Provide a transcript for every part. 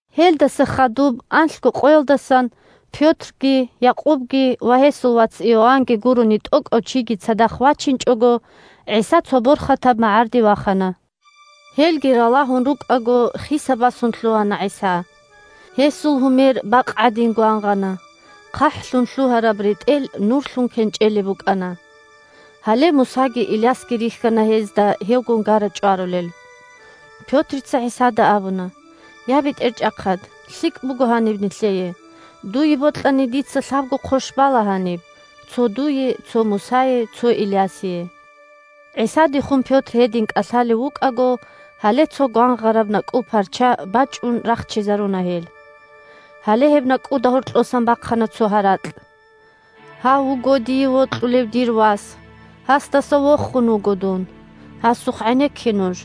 Гьелдаса хадуб анлъго къоялдасан Пётрги, Якъубги ва гьесул вац Иоаннги гурони тӀокӀав чиги цадахъ вачинчӀого, ГӀиса цо борхатаб магӀарде вахана. Гьелги ралагьун рукӀаго, хиса-басун лъугьана ГӀиса. Гьесул гьумер бакъ гӀадин гвангъана, хъахӀлъун лъугьараб ретӀел нурлъун кенчӀелеб букӀана. Гьале Мусаги Илясги рихьана гьезда гьевгун гара-чӀварулел. Пётрица ГӀисада абуна: – Я, БетӀерчӀахъад! ЛъикӀ буго гьаниб нилъее! Дуе бокьани, дица лъабго хъощ бала гьаниб: цо дуе, цо Мусае, цо Илясие. ГӀисадехун Пётр гьедин кӀалъалев вукӀаго, гьале цо гвангъараб накӀкӀул парча бачӀун рахчизаруна гьел. Гьале гьеб накӀкӀуда гьоркьосан бахъана цо гьаракь: – Гьав вуго дие вокьулев дир Вас, гьасдаса вохун вуго Дун! Гьасухъ гӀенекке нуж!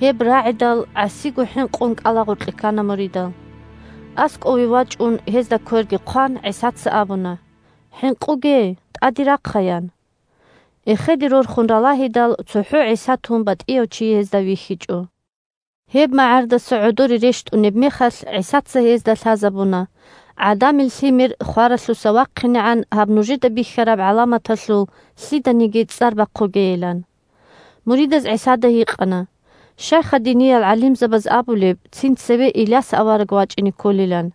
Гьеб рагӀидал гӀасиго хӀинкъун кӀалагъоркье ккана муридал. АскӀове вачӀун, гьезда кверги хъван, ГӀисаца абуна: – ХӀинкъуге! ТӀаде рахъа! – ян. Эхеде рорхун ралагьидал цохӀо ГӀиса тун батӀияв чи гьезда вихьичӀо. Гьеб магӀардаса гӀодоре рещтӀунеб мехалъ ГӀисаца гьезда лъазабуна ГӀадамил Лъимер хваралъуса вахъинегӀан гьаб нужеда бихьараб гӀаламаталъул лъиданиги цӀар бахъугейилан. Муридаз ГӀисада гьикъана: – Щайха диниял гӀалимзабаз абулеб цин цеве Иляс авараг вачӀине кколилан?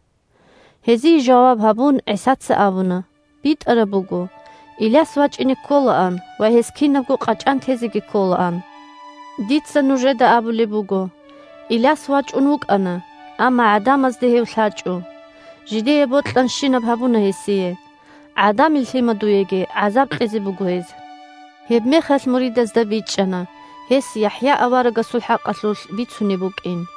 Гьезие жаваб гьабун ГӀисаца абуна: – БитӀараб буго, Иляс вачӀине кколаан ва гьес кинабго къачӀан тезеги кколаан. Дица нужеда абулеб буго: Иляс вачӀун вукӀана, амма гӀадамазда гьев лъачӀо, жидее бокьанщинаб гьабуна гьесие, ГӀадамил Лъимадуеги гӀазаб кьезе буго гьез. Гьебмехалъ муридазда бичӀчӀана гьес ЯхӀя аварагасул хӀакъалъулъ бицунеб букӀин.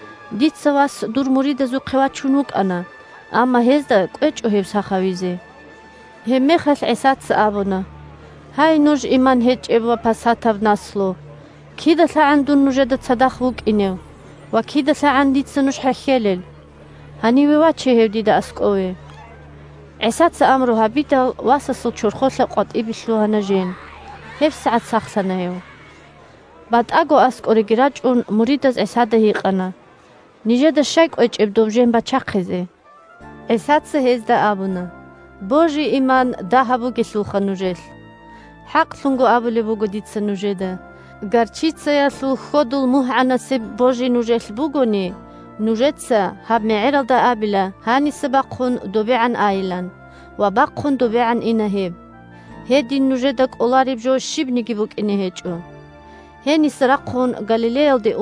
Дица вас дур муридазухъе вачун вукӀана, амма гьезда кӀвечӀо гьев сах гьавизе. Гьебмехалъ ГӀисаца абуна: – Гьай, нуж иман гьечӀеб ва пасатаб наслу! КидалъагӀан дун нужеда цадахъ вукӀинев ва кидалъагӀан дица нуж хӀехьелел! Гьаниве ваче гьев дида аскӀове. ГӀисаца амру гьабидал, васасул чорхолъа къватӀибе лъугьана жен. ГьебсагӀат сахлъана гьев. БатӀаго аскӀореги рачӀун, муридаз ГӀисада гьикъана: – Нижеда щай кӀвечӀеб доб жен бачахъизе? ГӀисаца гьезда абуна: – Божи-иман дагьаб бугелъулха нужелъ! ХӀакълъун абулеб буго дица нужеда: горчицаялъул хьодул мугьгӀанасеб божи нужелъ бугони, нужеца гьаб мегӀералда абила гьаниса бахъун добегӀан айилан, ва бахъун добегӀан ина гьеб. Гьедин нужеда кӀолареб жо щибниги букӀине гьечӀо Инжилалъул цо-цо хъвай-хъвагӀаязда ратула гьадинал калимабиги: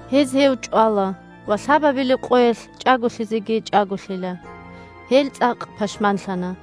Гьез гьев чӀвала ва лъабабилеб къоялъ чӀаголъизеги чӀаголъила. Гьел цӀакъ пашманлъана.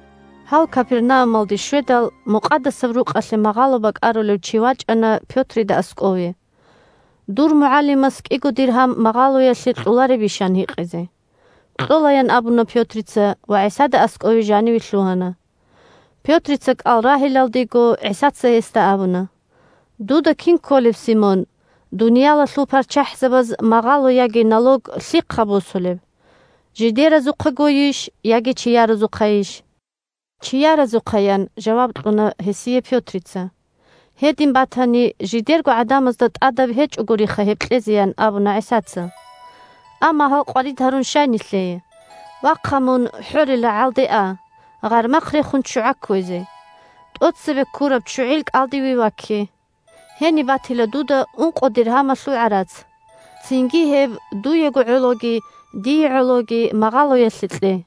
Гьал Капернаумалде щведал, Мукъадасаб Рукъалъе магъало бакӀарулев чи вачӀана Пётрида аскӀове: – Дур МугӀалимас кӀиго диргьам магъалоялъе кьоларебищ? – ан гьикьизе. – Кьола! – ян абуна Пётрица ва ГӀисада аскӀове жаниве лъугьана. Пётрица кӀал рагьилалдего, ГӀисаца гьесда абуна: – Дуда кин кколеб, Симон, дуниялалъул парччахӀзабаз магъало яги налог лъихъа босулеб? Жидеразухъагойищ яги чияразухъайищ? Чияразухъа, – ян жаваб кьуна гьесие Пётрица. – Гьедин батани, жидерго гӀадамазда тӀадаб гьечӀогуриха гьеб кьезе, – ян абуна ГӀисаца. Амма гьал къварид гьарун щай нилъее. Вахъа, мун хӀорил рагӀалде а, гъармахъ рехун ччугӀа кквезе. ТӀоцебе ккураб ччугӀил кӀалдиве вакке. Гьениб батила дуда ункъо диргьамалъул гӀарац. Цинги гьеб дуего гӀологи дие гӀологи магъалоялъе кье.